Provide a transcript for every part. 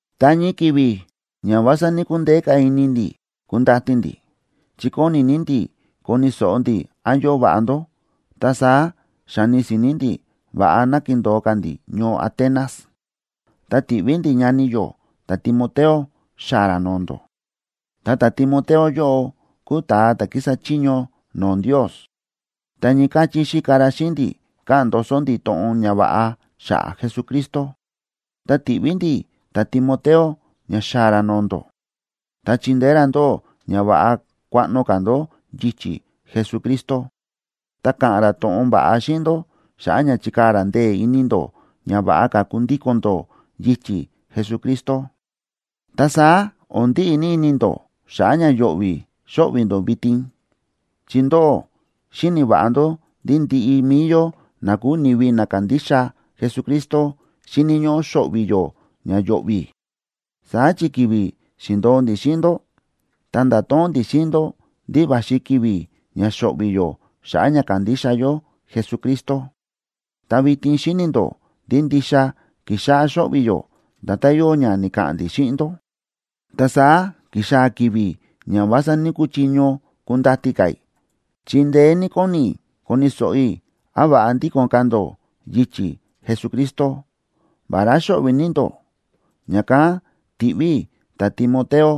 Ta ñii ki̱vi̱ ña o̱n vása ní‑kundeé ka̱ ini ndi̱ kundati ndi̱, chi kóni ní ndi̱ koni̱ so̱ꞌo ndi̱ án yóo va̱ꞌa ndó, ta saá xa̱ni si̱ni̱ ndi̱ va̱ꞌa ná kindo̱o ka̱ ndi̱ ñoo Atenas, ta ti̱ꞌví ndi̱ ñani yó ta̱Timoteo xaa̱ ra no̱o̱ ndó. Ta ta̱Timoteo yóꞌo kúu ta̱a ta̱ kísa chiño no̱o̱ Ndios, ta ñii káchí xíka ra xíꞌin ndi̱ káꞌa̱n ndoso ndi̱ to̱ꞌon ñava̱ꞌa xa̱ꞌa̱ Jesucristo. Ta ti̱ꞌví ndi̱ ta̱Timoteo ña xaa̱ ra no̱o̱ ndó ta chindeé ra ndóꞌó ña va̱ꞌa kuaꞌno ka̱ ndó yichi̱ Jesucristo, ta ka̱ꞌa̱n ra to̱ꞌon va̱ꞌa xíꞌin ndó xa̱ꞌa̱ ña chikaa̱ ra ndee̱ ini ndó ña va̱ꞌa ka̱ kundíko̱n ndó yichi̱ Jesucristo. Ta saá o̱n ndíꞌi ní ini ndó xa̱ꞌa̱ ña yo̱ꞌvi̱ xóꞌvi̱ ndó vitin. Chi ndóꞌó xíni̱ va̱ꞌa ndó ndí ndiꞌi mi̱i yó na kúu ni̱vi na kándixa Jesucristo xíni̱ ñóꞌó xo̱ꞌvi̱ yó ña yo̱ꞌvi̱. Saá chi ki̱vi̱ xi̱ndo̱o ndi̱ xíꞌin ndó, ta nda̱to̱ꞌon ndi̱ xíꞌin ndó ndí va̱xi ki̱vi̱ ña xo̱ꞌvi̱ yó xa̱ꞌa̱ ña kándixa yó Jesucristo. Ta vitin xíni̱ ndó ndí ndixa ki̱xáꞌá xo̱ꞌvi̱ yó nda̱tán yóo ña ni̱ka̱ꞌa̱n ndi̱ xíꞌin ndó. Ta saá ki̱xaa̱ ki̱vi̱ ña o̱n vása ní‑kuchiño kundati ka̱ i̱, chi ndeé ní kóni i̱ koni̱ so̱ꞌo i̱ án va̱ꞌa ndíko̱n ka̱ ndó yichi̱ Jesucristo, vará xóꞌvi̱ ní ndó. Ña̱kán ti̱ꞌví i̱ ta̱Timoteo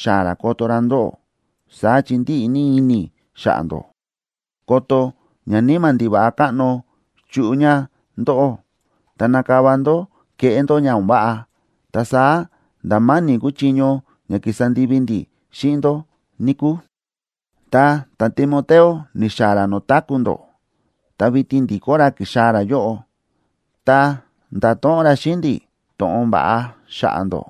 xaa̱ ra koto ra ndóꞌó, saá chi ndíꞌi ní ini i̱ xa̱ꞌa̱ ndó, ko̱to̱ ñaníma̱ ndiva̱ꞌa káꞌno chuꞌu ña ndóꞌó, ta nakava ndó keꞌé ndó ña o̱n váꞌa. Ta saá nda̱ ma̱ni̱ kuu chiño ña ki̱sa ndivi ndi̱ xíꞌin ndó, níkúu. Ta ta̱Timoteo ni̱xaa̱ ra no̱o̱ táku̱ ndó, ta vitin ndi̱kó ra ki̱xaa̱ ra yóꞌo, ta nda̱to̱ꞌon ra xíꞌin ndi̱ to̱ꞌon va̱ꞌa xa̱ꞌa̱ ndó.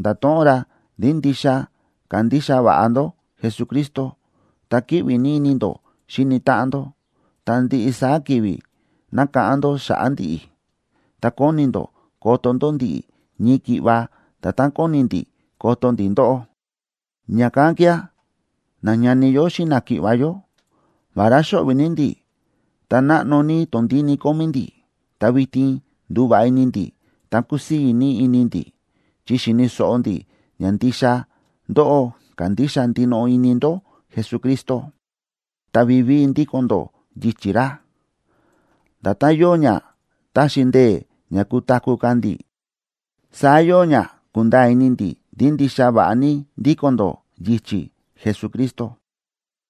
Nda̱to̱ꞌon ra ndí ndixa kándixa va̱ꞌa ndó Jesucristo, ta kíꞌvi ní ini ndó xíni táꞌan ndó, ta ndiꞌi saá ki̱vi̱ nákáꞌán ndó xa̱ꞌa̱ ndi̱ꞌi̱, ta kóni ndó koto ndó ndi̱ꞌi̱ ñii ki̱ꞌva nda̱tán kóni ndi̱ koto ndi̱ ndóꞌó. Ña̱kán kía̱, nañani yó xíꞌin náki̱ꞌva̱ yó, vará xóꞌvi̱ ní ndi̱ ta náꞌno ní tondíni kómí ndi̱, ta vitin ndu̱va̱ꞌa ini ndi̱ ta kúsii̱ ní ini ndi̱, chi xi̱ni̱ so̱ꞌo ndi̱ ña ndixa ndóꞌó kándixa ndinoꞌo ini ndó Jesucristo, ta vivíi ndíko̱n ndó yichi̱ ra. Nda̱tán yóo ña ta̱xi ndee̱ ña kutaku̱ ka̱ ndi̱, saá yóo ña kúnda̱a̱ ini ndi̱ ndí ndixa va̱ꞌa ní ndíko̱n ndó yichi̱ Jesucristo.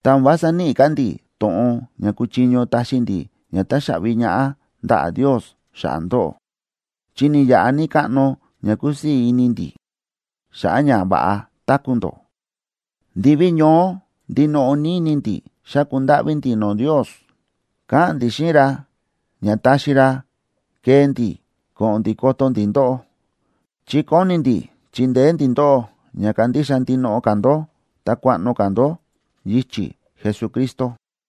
Ta o̱n vása níꞌi ka̱ ndi̱ to̱ꞌon ña kuchiño taxi ndi̱ ña táxaꞌvi ñaꞌá ndaꞌa̱ Ndios xa̱ꞌa̱ ndóꞌó, chi ni̱yaꞌa ní káꞌno ña kúsii̱ ní ini ndi̱ xa̱ꞌa̱ ña va̱ꞌa táku̱ ndó. Ndiví ñoó ndinoꞌo ní ini ndi̱ xáku ndáꞌví ndi̱ no̱o̱ Ndios, káꞌa̱n ndi̱ xíꞌin ra ña taxi ra kee ndi̱ ko̱ꞌo̱n ndi̱ koto ndi̱ ndóꞌó. Chi kóni ndi̱ chindeé ndi̱ ndóꞌó ña kandixa ndinoꞌo ka̱ ndó ta kuaꞌno ka̱ ndó yichi̱ Jesucristo.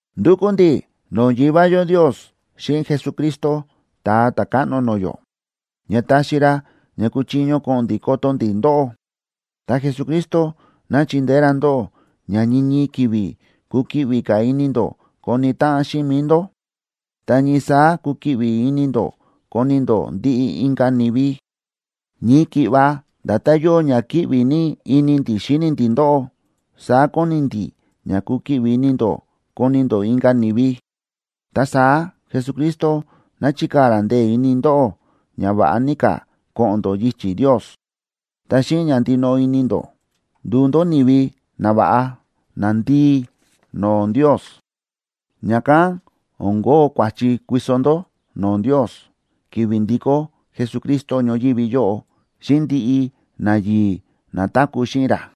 Ndúkú ndi̱ no̱o̱ Yivá yó Ndios xíꞌin Jesucristo, Ta̱a Ta̱káꞌno no̱o̱ yó, ña taxi ra ña kuchiño ko̱ꞌo̱n ndi̱ koto ndi̱ ndóꞌó. Ta Jesucristo ná chindeé ra ndóꞌó ña ñii ñii ki̱vi̱ kukiꞌvi ka̱ ini ndó koni táꞌan xíꞌin mi̱i ndó, ta ñii saá kukiꞌvi ini ndó koni ndó ndiꞌi inka̱ ni̱vi. Ñii ki̱ꞌva nda̱tán yóo ña kíꞌvi ní ini ndi̱ xíni ndi̱ ndóꞌó saá kóni ndi̱ ña kukiꞌvi ini ndó koni ndó inka̱ ni̱vi. Ta saá Jesucristo ná chikaa̱ ra ndee̱ ini ndóꞌó ña va̱ꞌa ní ka̱ ko̱ꞌo̱n ndó yichi̱ Ndios, ta xíꞌin ña ndinoꞌo ní ini ndó nduu ndó ni̱vi nava̱ꞌa, nandii no̱o̱ Ndios. Ña̱kán o̱n kóo kua̱chi kuiso ndó no̱o̱ Ndios, ki̱vi̱ ndikó Jesucristo ñoyívi yóꞌo, xíꞌin ndiꞌi nayi̱i̱ na táku̱ xíꞌin ra.